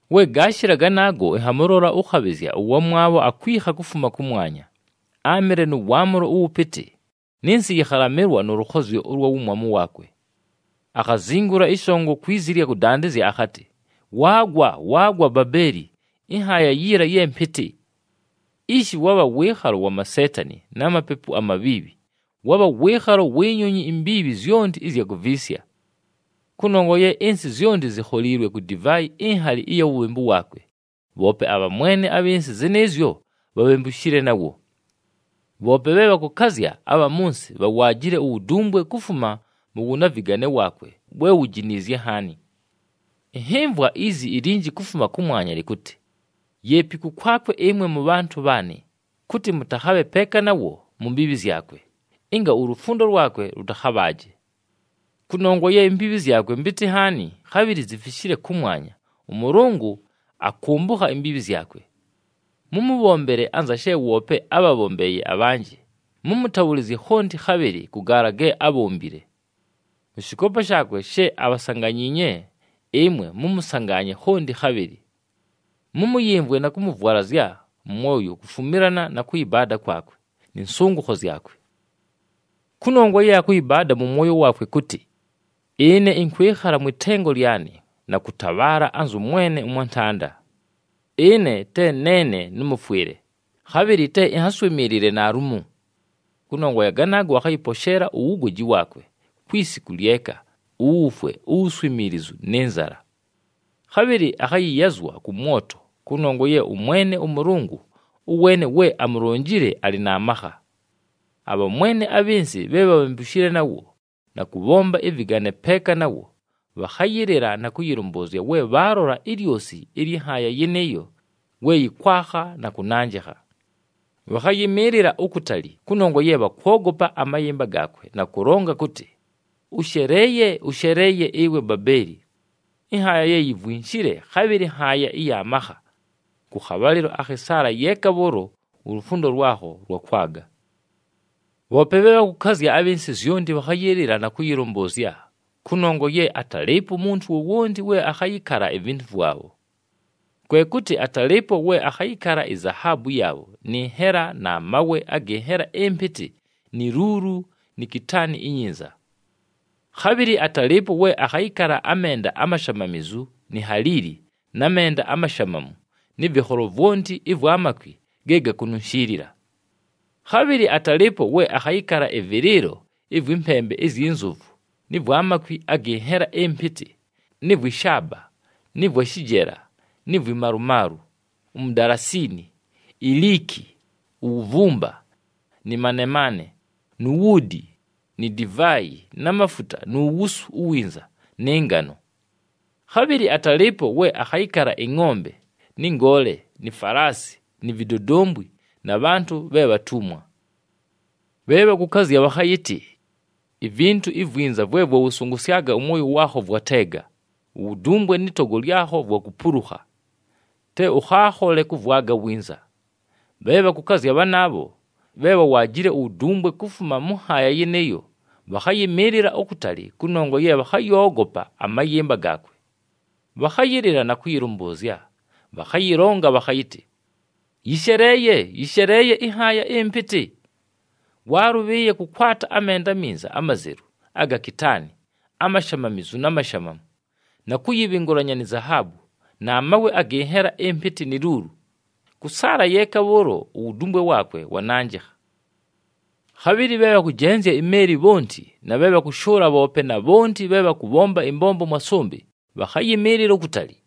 We gaashɨla ganaago, ɨnhamʉlola ʉkhabhɨzya ʉwamwabho akwikha kufuma kʉmwanya. Áamɨle nʉ waamʉlo ʉwʉpɨtɨ, nɨ nsɨ yɨkhalamɨlwa nʉ lʉkhozyo ʉlwa wumwamu waakwe. Akhazingula ɨshongo kwi zi ɨlya kʉdandɨzya akhatɨ, “Waagwa, waagwa Babeeli, ɨnhaaya yiila ye mpɨtɨ! Ishi wabha wɨɨkhalo wa maseetani na mapepu amabhiibhi, wabha wɨɨkhalo wi nyonyi imbiibhi zyonti ɨzya kuviisya. Kʉnongwa ye ɨnsɨ zyonti zikholiilwe ku divaayi inhali ɨya wubhembu waakwe, bhoope abhamwene abhɨ nsɨ zɨnɨɨzyo bhabhembushile nawo. Bhoope bhe bhakʉkazya abha mʉ nsɨ bhawaajile uwudumbwe kufuma mʉ wʉnavɨgane waakwe we wujiniizye nhaani.” Ɨnhɨmvwa izi ilinji kufuma kʉmwanya lɨkʉtɨ, “Yeepi kʉkwakwe ɨmwe mʉbhantʉ bhaanɨ, kʉtɨ mʉtakhabhe peeka nawo mu mbiibhi zyakwe, ɨnga ulufundo lwakwe lʉtakhabhaaje. Kʉnongwa ye imbiibhi zyakwe mpɨtɨ nhaani, khabhɨlɨ zifishile kʉmwanya, ʉMʉlʉngʉ akʉmbʉkha imbiibhi zyakwe. Mʉmʉbhombele anza she woope ábhabhombeeye abhanjɨ, mʉmʉtabhʉlɨzye khonti khabhɨlɨ kʉ gaala ge ábhombile. Mʉ shɨkoopa shaakwe she abhasanganyiinye, ɨmwe mʉmʉsangaanye khonti khabhɨlɨ. Mʉmʉyɨmvwe na kʉmʉvwalazya mʉ mwoyo kufumilana na kʉyɨbaada kwakwe, nɨ nsʉngʉkho zyakwe. Kʉnongwa ye akʉyɨbaada mʉ mwoyo waakwe kʉtɨ, ‘Ɨne ɨnkwɨkhala mwɨ tengo lyanɨ, na kʉtabhaala anzʉ mwene ʉmwantanda. Ɨne te neene nʉmʉfwɨle, khabhɨlɨ te ɨnhaswɨmɨɨlɨle naalumo!’ Kʉnongwa ya ganaago, akhayɨposheela uwugoji waakwe kwi siku lyeka, uwufwe, uwuswimiilizu nɨ nzala. Khabhɨlɨ akhayɨyazwa kʉ mwoto, kʉnongwa ye ʉMwene ʉMʉlʉngʉ ʉweene we amulonjile alɨ na makha.” Abhamwene abhɨ nsɨ bhe bhabhembushile nawo na kʉbhomba ɨvɨgane peeka nawo, bhakhayɨlɨla na kʉyɨlʉmbʉʉzya we bhaalola ilyosi ɨlyɨ nhaaya yɨnɨɨyo we yɨkwakha na kʉnanjɨkha. Bhakhayɨmɨɨlɨla ukutali kʉnongwa ye bhakwogopa amayɨmba gaakwe na kʉlonga kʉtɨ, “Ʉsheleeye! Ʉsheleeye ɨwe Babeeli! Ɨnhaaya ye yivwinshile, khabhɨlɨ nhaaya ɨya makha! Kʉ khabhalɨlo akhɨ saala yeeka bhʉʉlo ulufundo lwakho lwakwaga.” Bhoope bhe bhakʉkazya abhɨ nsɨ zyonti bhakhayɨlɨla na kʉyɨlʉmbʉʉzya, kʉnongwa ye atalɨɨpo umuntu wowonti we akhayɨkala ivintu vwabho. Kwe kʉtɨ atalɨɨpo we akhayɨkala izahaabu yaabho nɨ nhela na mawe agɨ nhela ɨmpɨtɨ ni luulu ni kitaani inyinza. Khabhɨlɨ atalɨɨpo we akhayɨkala amenda amashamamizu ni haliili na menda amashamamu nɨ vɨkholo vwonti ɨvwa makwi ge gakununshiilila. Khabhɨlɨ atalɨɨpo we akhayɨkala ɨvɨlɨɨlo ɨvwɨ mpembe izyi nzovu nɨ vwa makwi agɨ nhela ɨmpɨtɨ nɨ vwɨ shaaba nɨ vwa shɨjela ni vwi malumaalu, umudalasiini, iliiki, uwuvumba, nɨ manemaane, nu wuudi ni divaayi na mafuta nu wusu uwinza nɨ ngano. Khabhɨlɨ atalɨɨpo we akhayɨkala ɨngʼombe nɨ ngoole ni falaasi ni vidodombwi na bhantʉ bhe bhatumwa. Bhe bhakʉkazya bhakhayɨtɨ, “Ivintu ivwinza vwe vwawʉsʉngʉsyaga ʉmwoyo waakho vwateega, uwudumbwe nɨ togo lyakho vwakupulukha, te ʉkhaakhole kʉvwaga winza!” Bhe bhakʉkazya bhanaabho bhe bhawaajile uwudumbwe kufuma mʉ nhaaya yɨnɨɨyo, bhakhayɨmɨɨlɨla ukutali kʉnongwa ye bhakhayoogopa amayɨmba gaakwe. Bhakhayɨlɨla na kʉyɨlʉmbʉʉzya, bhakhayɨlonga bhakhayɨtɨ, “Yɨsheleeye! Yɨsheleeye ɨnhaaya ɨmpɨtɨ! Waalʉbhɨɨye kʉkwata amenda aminza amazelu aga kitaani, amashamamizu na mashamamu na kʉyɨbhɨngʉlanya ni zahaabu na mawe agɨ nhela ɨmpɨtɨ ni luulu! Kʉ saala yeeka bhʉʉlo uwudumbwe waakwe wananjɨkha!” Khabhɨlɨ bhe bhakʉjenzya imeeli bhonti na bhe bhakʉshʉʉla bhoope na bhonti bhe bhakʉbhomba ɨmbombo mwa sʉmbɨ, bhakhayɨmɨɨlɨla ukutali.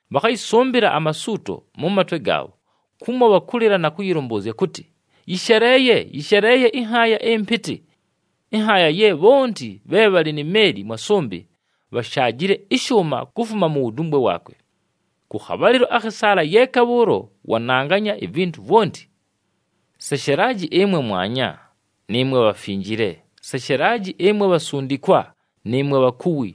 Bhakhayɨsʉmbɨla amasuuto mʉ matwe gaabho kumo bhakʉlɨla na kʉyɨlʉmbʉʉzya kʉtɨ, “Yɨsheleeye! Yɨsheleeye ɨnhaaya ɨmpɨtɨ! Ɨnhaaya ye bhonti bhe bhalɨ ni meeli mwa sʉmbɨ, bhashaajile ɨshʉʉma kufuma mu wudumbwe waakwe. Kʉ khabhalɨlo akhɨ saala yeeka bhʉʉlo wananganya ivintu vwonti! Seshelaji ɨmwe mwanya, nɨɨmwe bhafinjile. Seshelaji ɨmwe bhasundikwa, nɨɨmwe bhakuwi!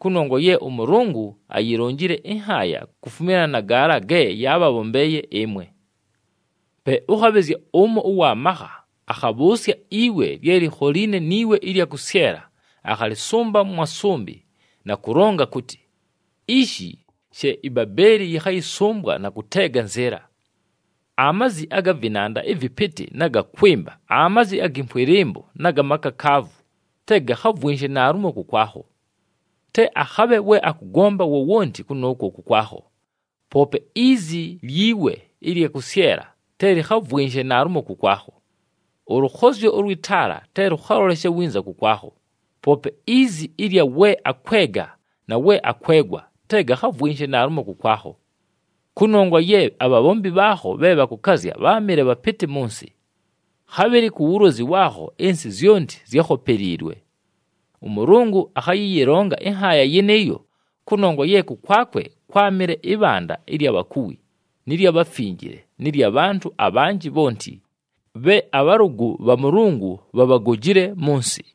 Kʉnongwa ye ʉMʉlʉngʉ ayilonjile ɨnhaaya kufumilana na gaala ge yaabhabhombeeye ɨmwe!” Pe ʉkhabhɨzya ʉmo ʉwa makha akhabhʉʉsya iwe lye likholiine ni we ɨlya kʉsyela, akhalɨsʉmba mwa sʉmbɨ na kʉlonga kʉtɨ, “Ishi she iBabeeli yɨkhayɨsʉmbwa na kʉteega nzɨɨla. Amazi aga vɨnanda ɨvɨpɨtɨ na ga kwɨmba, amazi agɨ mfwɨlɨmbo na ga makakaavu, te gakhavwɨnshe naalumo kʉkwakho. Te akhabhe we akʉgomba wowonti kʉnʉʉkwo kʉkwakho, poope izi lyi we ɨlya kʉsyela te lɨkhavwɨnshe naalumo kʉkwakho. Ʉlʉkhozyo ʉlwɨ taala te lʉkhaloleshe winza kʉkwakho, poope izi ɨlya we akwega na we akwegwa, te gakhavwɨnshe naalumo kʉkwakho. Kʉnongwa ye abhabhombi bhaakho bhe bhakʉkazya bháamɨle bhapɨtɨ mʉ nsɨ. Khabhɨlɨ ku wulozi waakho ɨnsɨ zyonti zyákhopeliilwe! ɄMʉlʉngʉ akhayɨyɨlonga ɨnhaaya yɨnɨɨyo, kʉnongwa ye kʉkwakwe kwámɨle ɨbhanda ɨlya bhakuwi nɨ lya bhafinjile nɨ lya bhantʉ abhanjɨ bhonti, bhe abhalʉgʉ bha Mʉlʉngʉ bhabhagojile mʉ nsɨ.”